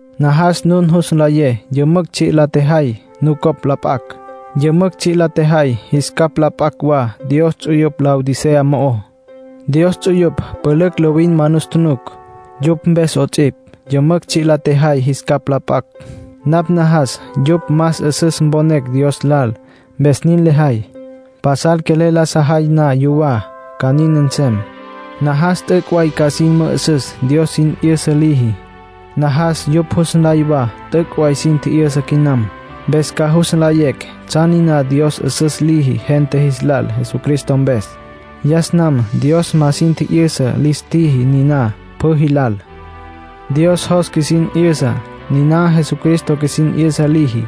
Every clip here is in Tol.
Najas nun jus nlayé yümücj tsji' la tjejay nucopj la p'acj. Yümücj tsji' la tjejay jis capj la p'acj wa Dios ts'uyupj Laodicea mo'ó. Dios ts'uyupj pülücj lovin ma nus tjunuc. Yupj mpes 'ots'ipj yümücj tsji' la tjejay jis capj la p'acj. Napj najas yupj más 'üsüs mponecj Dios lal, mpes nin lejay. Pasal quelel la sajay na yuwá, ca nin nsem. Najas t'üc' way ca sin mü'üsüs Dios sin 'yüsa liji. Najas yupj jus nlay wa t'üc' way sin tji'yüsa quinam. Mpes ca jus nlayecj tsjan niná Dios 'üsüs liji gente jis lal Jesucristo mpes. Yas nam Dios ma sin tji'yüsa lis tjiji niná pjü jilal. Dios jos qjuisin 'yüsa, niná Jesucristo qjuisin 'yüsa liji.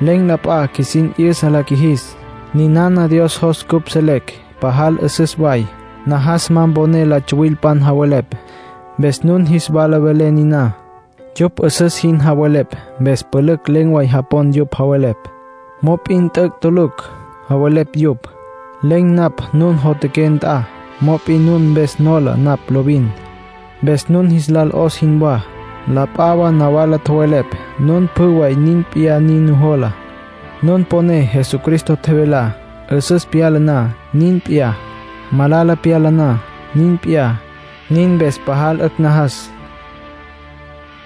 Len̈ la p'a qjuisin 'yüsa la qjuijis. Ninana Dios jos cupj selecj, pajal 'üsüs way. Najas ma mponé la tsuwilpan javelepj, mpes nun jis wala velé niná. Yupj 'üsüs jin javelepj, mpes pülücj len̈ way japon yupj javelepj. Mop'in t'üc' tulucj javelepj yupj. Len̈ napj nun jotjaqué nt'a, mop'in nun mpes nola napj lovin, mpes nun jis lal 'os jinwá. La p'a wa nawala tjowelepj nun pjü way nin p'iyá nin nujola, nun poné Jesucristo tjevelá. 'Üsüs pyala na, nin p'iyá; malala pyala na, nin p'iyá. Nin mpes pajal 'ücj najas.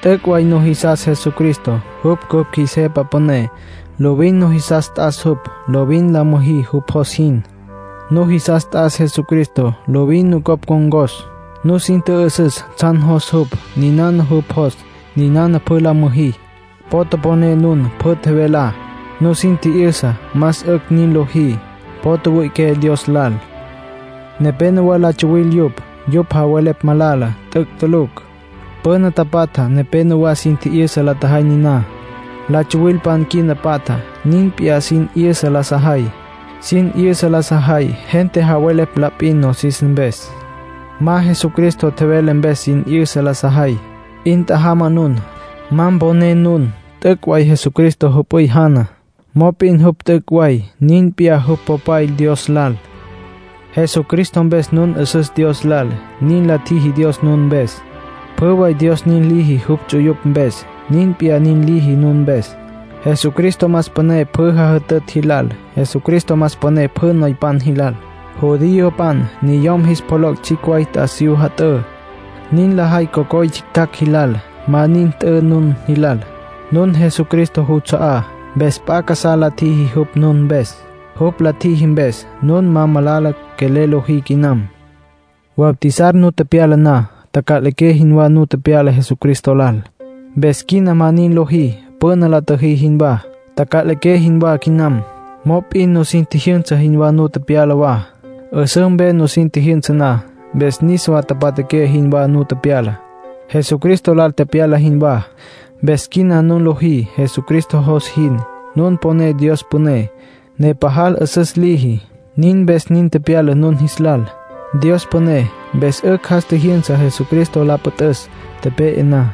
T'üc' way nujisastsja Jesucristo. Jupj cupj qjuis Jepa Püné. Lovin nujisas t'as jupj. Lovin la müjí jupj jos jin. Nujisas t'as Jesucristo lovin nucopj ncon̈cos. Nusin tjü'üsüs tsjan jos jupj. Ninana jupj jos, niná pjü la müjí. Po toponé nun, pjü tjevelá. Nusin tji'yüsa, más 'ücj nin lojí. Po tjüwüi'iqué Dios lal. Nepénowa la tsuwil yupj. Yupj javelepj malala, t'üc' tulucj. Püna tapatja nepenowá sin tji'yüsa la tjajay niná. La tsuwilpan quina patja nin p'iyá sin 'yüsa la sajay. Sin 'yüsa la sajay, gente javelepj la p'in nosis mpes. Ma Jesucristo tjevele mpes sin 'yüsa la sajay. 'In tjajama nun, ma mponé nun. T'üc' way Jesucristo jüp'üy jana, mop'in jupj t'üc' way nin p'iyá jupj Popay Dios lal. Jesucristo mpes nun 'üsüs Dios lal, nin la tjiji Dios nun mpes. Pjü way Dios nin liji jupj ts'uyupj mpes, nin p'iyá nin liji nun mpes. Jesucristo más püné pjü jajütütj jilal. Jesucristo más püné pjü noypan jilal. Judiopan niyom jis pjoloc' tsjicj way t'asiyú jat'ǘ. Nin lajay cocoy tsjictjacj jilal. Ma nin t'ü nun jilal. Nun Jesucristo juts'a'á, mpes p'a casá la tjiji jupj nun mpes. Jupj la tjiji mpes, nun ma malala quelel lojí quinam. Bautizar nu tepyala na, taca'liqué jinwá nu tepyala Jesucristo lal. Mpes quina ma nin lojí püna la tjüjí jinwá. Taca'liqué jinwá quinam, mop'in nusin tjijyünsa jinwá nu tepyala wa, 'üsǘ mpe nusin tjijyünsa na. Mpes niswa tapatjaqué jinwá nu tepyala, Jesucristo lal tepyala jinwá. Mpes quina nun lojí Jesucristo jos jin. Nun poné Dios püné, ne pajal 'üsüs liji; nin mpes nin tepyala nun jis lal. Dios püné, mpes 'ücj jas tjijyünsa Jesucristo la püt'üs tepe'e na.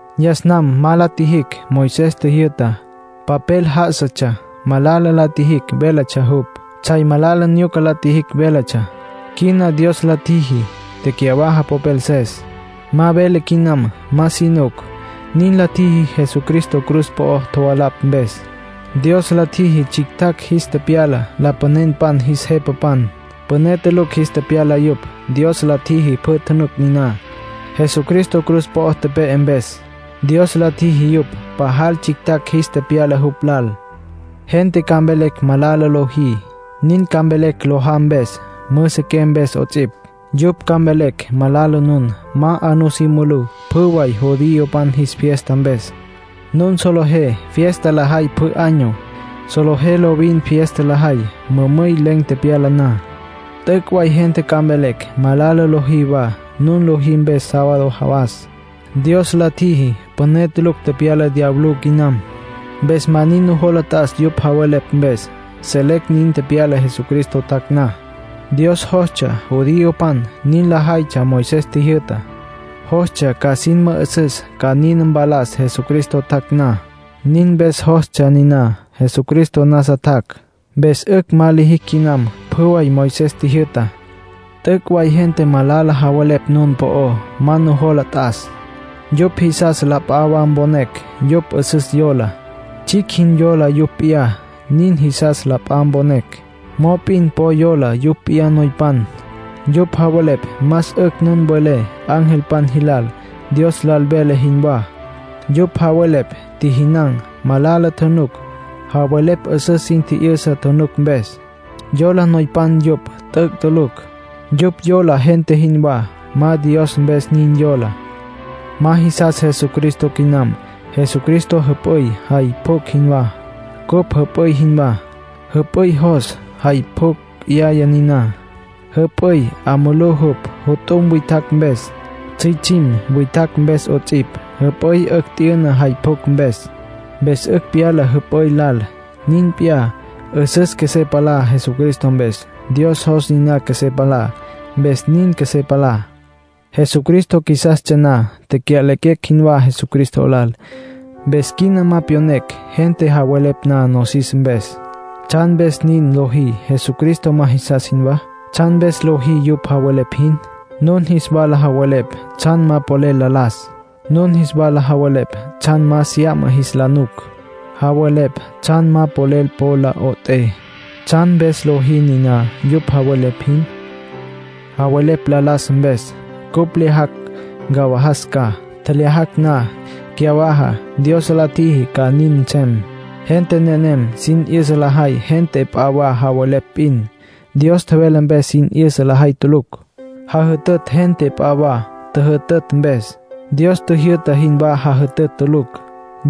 Yas nam ma la tjijicj Moisés tjijyü'tá. Papel já'asatsja, malala la tjijicj véletsja jupj. Tsjay malala nyuca la tjijicj véletsja. Quina Dios la tjiji tecyawaja popelses. Ma vele quinam. Ma si nuc. Nin la tjiji Jesucristo cruz po'o tjovalapj mpes. Dios la tjiji tsjictjacj jis tepyala lapanenpan jis jepapan. Püné tulucj jis tepyala yupj. Dios la tjiji pjü tjunuc niná. Jesucristo cruz po'o tepe'e mpes, Dios la tjiji yupj pajal tsjictjacj jis tepyala jupj lal. Gente ca mvelecj malala lojí. Nin ca mvelecj lojá mpes, müsiqué mpes 'ots'ipj. Yupj ca mvelecj malala nun ma 'a nusí mulú pjü way judiopan jis fiesta mpes. Nun solejé fiesta lajay pjü año. Solejé lovin fiesta lajay mümüy len̈ tepyala na. T'üc' way gente ca mvelecj malala lojí wa, nun lojí mpes sábado jawas. Dios la tjiji püné tulucj tepyala diablú quinam, mpes ma nin nujola t'as yupj javelepj mpes. Selecj nin tepyala Jesucristo tjac' na. Dios jostsja judiopan nin lajaytsja Moisés tjijyü'tá; jostsja ca sin mü'üsüs ca nin mpalas Jesucristo tjac' na, nin mpes jostsja niná. Jesucristo nasa tjac'. Mpes 'ücj ma lijicj quinam pjü way Moisés tjijyü'tá. T'üc' way gente malala javelepj nun po'ó. Ma nujola t'as. Yupj jisas la p'a wa mponecj yupj 'üsüs yola, tsjicj jin yola yupj p'iyá, nin jisas la p'a mponecj. Mop'in po yola yupj p'iyá noypan. Yupj javelepj más 'ücj nun welé angelpan jilal, Dios lal welé jinwá. Yupj javelepj tjijinan̈, malala tjunuc. Javelepj 'üsüs sin tji'yüsa tjunuc mpes. Yola noypan yupj. T'üc' tulucj. Yupj yola gente jinwá. Ma Dios mpes nin yola. Ma jisas Jesucristo quinam. Jesucristo jüp'üy jay pjucj jinwá. Cupj jüp'üy jinwá. Jüp'üy jos, jay pjucj 'yaya niná. Jüp'üy 'a mulú jupj jut'um witjacj mpes, tsjüitsjim witjacj mpes 'ots'ipj. Jüp'üy 'ücj t'yüna jay pjucj mpes. Mpes 'ücj pyala jüp'üy lal. Nin p'iyá, 'üsüs qjuesé palá Jesucristo mpes. Dios jos niná qjuesé palá, mpes nin qjuesé palá. Jesucristo qjuisastsja na, tecya'lequecj jinwá Jesucristo lal. Mpes quina ma pyonecj gente javelepj na nosis mpes. ¿Tsjan mpes nin lojí Jesucristo ma jisas jinwá? ¿Tsjan mpes lojí yupj javelepj jin? Nun jis wala javelepj tsjan ma polel la las. Nun jis wala javelepj tsjan ma sya'ma jis la nuc. Javelepj tsjan ma polel po lo 'ot'é. ¿Tsjan mpes lojí niná yupj javelepj jin? Javelepj la las mpes. Cupj lyajacj ncawajas ca; tjelyajacj na, cyawaja. Dios la tjiji ca nin nsem. Gente nenem sin 'yüsa lajay gente p'a wa tjowelepj p'in; Dios tjevele mpes sin 'yüsa lajay tulucj. Jajütütj gente p'a wa tjüjütütj mpes; Dios tjijyü'ta jinwá jajütütj tulucj.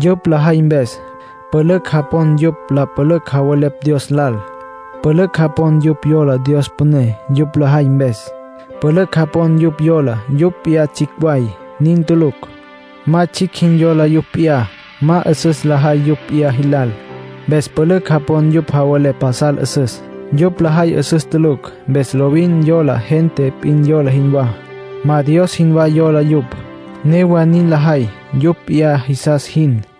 Yupj lajay mpes, pülücj japon yupj la pülücj javelepj Dios lal. Pülücj japon yupj yola Dios püné. Yupj lajay mpes, pülücj japon yupj yola yupj p'iyá tsjicj way. Nin tulucj. Ma tsjicj jin yola yupj p'iyá. Ma 'üsüs lajay yupj p'iyá jilal. Mpes pülücj japon yupj javelepj pasal 'üsüs. Yupj lajay 'üsüs tulucj. Mpes lovin yola gente p'in yola jinwá. Ma Dios jinwá yola yupj. Newa nin lajay yupj p'iyá jisas jin.